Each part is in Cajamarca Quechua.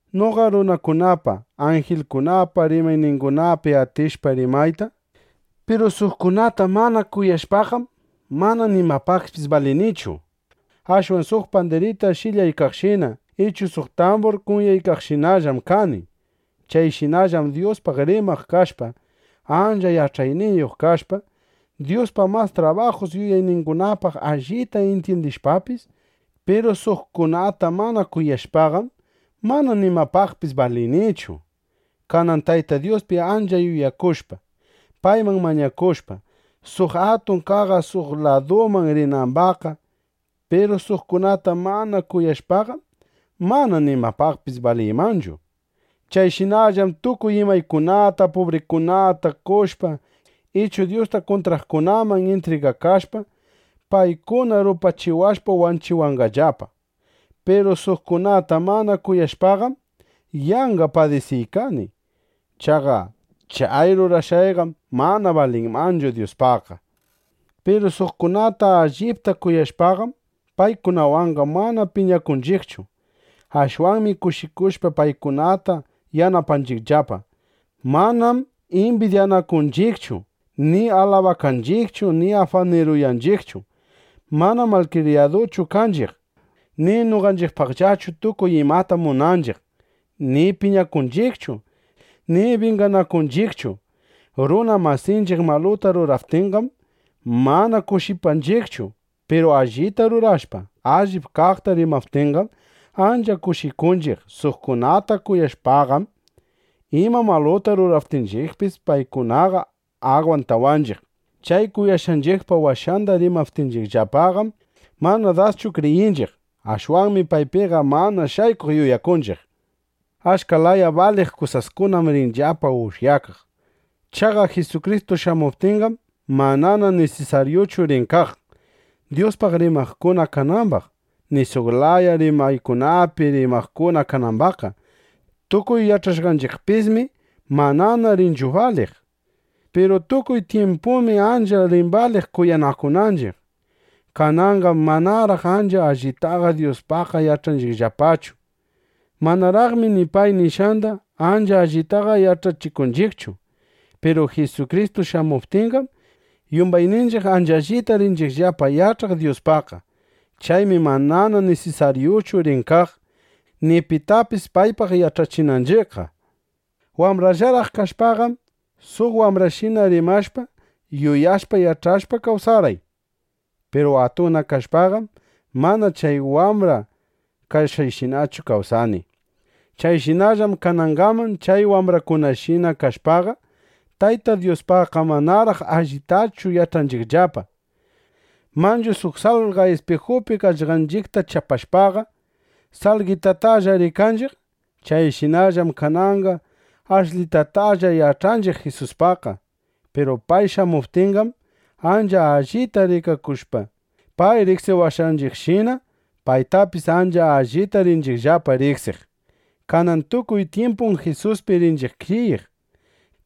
Noqa runakunapa, anjilkunapa rimayningunapi atishpa rimayta, piru suqkunata mana kuyashpaqam, mana nimapaqpis balinichu. Ashwan suq pandirita sh'ilyaykaqshina ichu suq tambur kunyaykaqshinallam kani. Chayshinallam Dyuspaq rimaq kashpa, ancha yach'ayniyuq kashpa, Dyuspa mas trabajus yuyayningunapaq allita intyindishpapis, piru suqkunata mana kuyashpaqam, mana nimapaqpis balinichu. Kanan Tayta Dyuspi ancha yuyakushpa, payman mañakushpa, suq atun qaqa suq laduman rinambaqqa, piru suqkunata mana kuyashpaqam, mana nimapaqpis baliymanchu. Chayshinallam tukuy imaykunata pubrikunata qoshpa ichu Dyusta kuntraqkunaman intrigakashpa, paykuna rupachiwashpa wanchiwananllapa, piru suqkunata mana kuyashpaqam, yanqa padisiykani. Chaqa chay rurashqayqam mana balinmanchu Dyuspaqqa. Piru suqkunata allipta kuyashpaqam, paykunawanqa mana piñakunchiqchu. Ashwanmi kushikushpa, paykunata yanapanchiqllapa. Manam imbidyakunchiqchu ni alabakanchiqchu ni afaniruyanchiqchu. Manam malkriyaduchu kanchiq, ni noqanchiqpaqllachu tukuy imata munanchiq, ni piñakunchiqchu, ni binganakunchiqchu. Runa masinchiq maluta ruraptinqam, mana kushipanchiqchu. Piru allita rurashpa, allip kaqta rimaptinqam, ancha kushikunchiq. Suqkunata kuyashpaqam, ima maluta rurawaptinchiqpis, paykunataqa agwantanchiq. Chay kuyashqanchiqpa washanda rimaptinllapaqam, mana daschu kriyinchiq. Ashwanmi paypiqa mana shaykuq yuyakunchiq. Achka laya baliq kusaskunam rinllapa ushyakaq. Chaqa Jisukristu shamuptinqam, manana nisisaryuchu rin kaq, Dyuspaq rimaqkuna kanambaq, ni suq laya rimaykunapi rimaqkuna kanambaqqa. Tukuy yach'ashqanchiqpismi manana rinchu baliq. Piru tukuy tyimpumi ancha rin baliq kuyanakunanchiq. Kananqam manaraq ancha allitaqa Dyuspaqqa yach'anchiqllapachu. Manaraqmi ni pay nishqanda ancha allitaqa yach'achikunchiqchu. Piru Jisukristu shamuptinqam, yumbayninchiq ancha allita rinchiqllapa yach'aq Dyuspaqqa. Chaymi manana nisisaryuchu rin kaq, ni pitapis paypaq yach'achinanchiqqa. Wambrallaraq kashpaqam, suq wambrashina rimashpa, yuyashpa, yach'ashpa, kawsarqay. Piru atunna kashpaqam, manana chay wambra kashqayshinachu kawsani. Chayshinallam kanangaman chay wambrakunashina kashpaqa, Tayta Dyuspaqqa manaraq allitachu yach'anchiqllapa. Manchu suq salqa ispijupi qaqllanchiqta chapashpaqa, salqetatalla rikanchiq. Chayshinallam kananqa ashlitatalla yach'anchiq Jisuspaqqa. Piru pay shamuptinqam, ancha allita rikanakushpa, pay riqsiwashqanchiqshina, paytapis ancha allita rinchiqllapa riqsiq. Kanan tukuy tyimpum Jisuspi rinchiq kriyiq.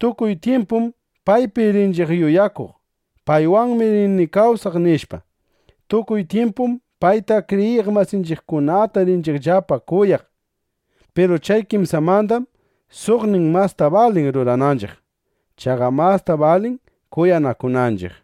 Tukuy tyimpum paypi rinchiq yuyakuq: Paywanmi rini kawsaq nishpa. Tukuy tyimpum payta, kriyiq masinchiqkunata rinchiqllapa kuyaq. Piru chay kimsamandam suqnin masta balin rurananchiq. Chaqa masta balin kuyanakunanchiq.